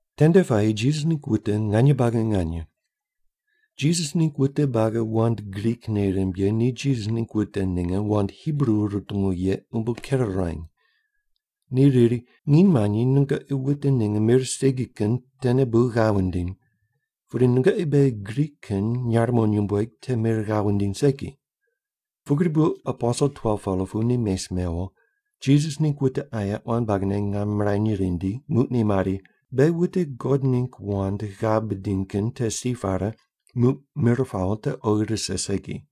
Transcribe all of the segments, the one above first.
Tende puayi Jisas ningg wute nganye buagi nganye. Jisas ningg wute buagi wand Grik nei rimb ye ni Jisas ningg wute ninge wand Hibru rutungu ye umbo ker ruany. Ni riri, “Nginy manyi nungoqi wute ninge mir segi kin tene bu ghav wundiny, pudi nungoqi beghi Grik kin nyarimo nyumbueg te mir ghav wundiny segi.” Pugri bu aposel 12-pela pu ni mes mewo, Jisas ningg wute aye quan buagine ngam mirany rindi, muq ni mari, “Beghi wute God ningg wand ghav bidiny kin te si pare muq mir pawo te oghi rise segi.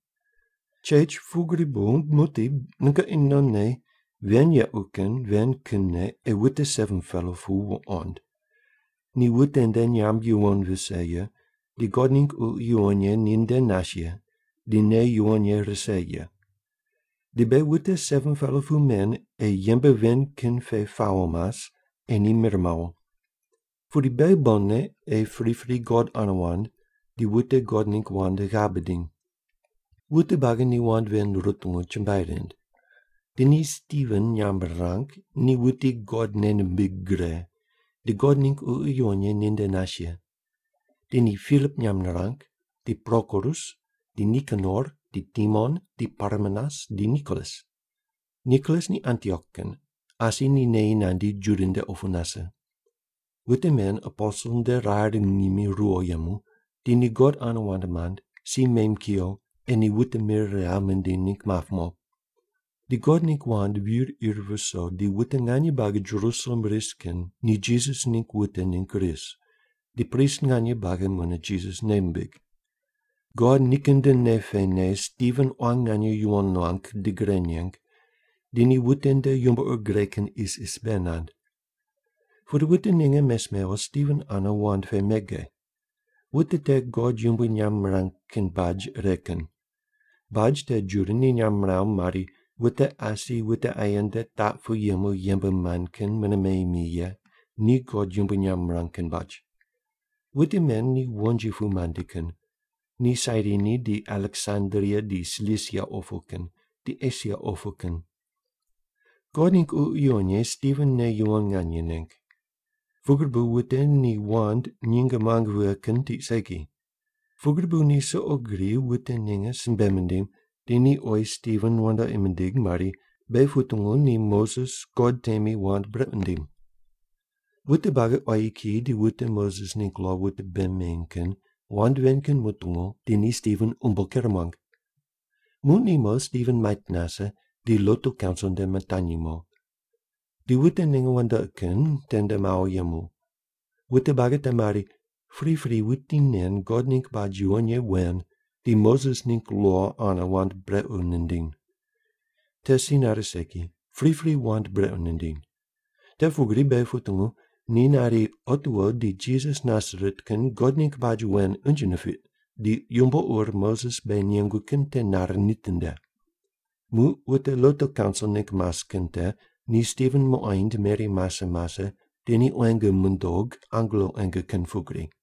Chech, pugri bu muqdi nungoqi nonne ven yequ kin ven kinne ei wute 7-pela pu wuqond. Ni wute nde nyamb yuwon vise ye, di God ningg Ququ Yuwon Ye ni nde nas ye, di nei yuwon ye rise ye. Di beghi wute 7-pela pu men ei yembe ven kin pe pawo mas, ei ni mir mawo. Pudi beghi bonne ei pripri God ane wand, di wute God ningg wand ghav bidiny.” Wute buagi ni wand ven rutungu, chumbuai rind. Di ni Stiven nyamb rirang, ni wuti God nei nimbig gre, di God ningg Ququ Yuwon Ye ni nde nas ye. Di ni Pilip nyamb rirang, di Prokorus, di Nikanor, di Timon, di Parmenas, di Nikolas. Nikolas ni Antiok kin, asi ni neyi nandi Juda nde opu nase. Wute men aposel nde rar ngimi ruwo yemu, di ni God ane wand mand, si mem kuyo ei ni wute mir ghav mindiny ningg map mo. Di God ningg wand vir ir viso di wute nganye buagi Jerusalem ris kin ni Jisas ningg wute ningg ris, di prist nganye buagi mune Jisas nei mimbig. God nikin nde nei pene Stiven quan nganye yuwon nuang di gre neng, di ni wute nde yumbo ur gre kin isis bei nand. Pudi wute ninge mes mewo Stiven ane wand pe mege. Wute te God yumbui nyamb mirang kin baj ire kin. Baj te Juda ni nyamb miraw mari, wute asi wute aye nde taq pu yemu yembe mand kin mune meyi mi ye ni God yumbui nyamb mirang kin baj. Wute men ni wonji pu mandi kin. Ni Sairini, di Aleksandria, di Silisia opu kin, di Esia opu kin. God ningg Ququ Yuwon Ye Stiven nei yuwon nganye neng. Pugri bu wute ni wand nyinge muang vighe kin tiq segi. Pugri bu ni suqo gri wute ninge simbe mindim, di ni oyi Stiven wandoqi mindig mari, “Beghi putungu ni Moses God temi wand brequ nindim.” Wute buagi, quayi kiyi, di wute Moses ningg lo wute bei meny kin wand ven kin mutungu, di ni Stiven umbo ker muang. Muq ni mo, Stiven mait nase, di lotu kaunsil nde mitanyi mo. Di wute ninge wandoqi kin tende mawo yemu. Wute buagi te mari, “Pripri wuti nen God ningg baj yuwon ye wen di Moses ningg lo ane wand brequ nindiny. Te si nare segi. Pripri wand brequ nindiny. Te pugri beghi putungu ni nari, ‘Otiwo di Jisas Nasaret kin God ningg baj wen unje nipiq, di yumbo ur Moses beghi nengu kin te nare nitinde’!” Muq wute lotu kaunsil ningg mas kin te ni Stiven muqoind meri mase mase di ni quenge mundog angelo quenge kin pugri.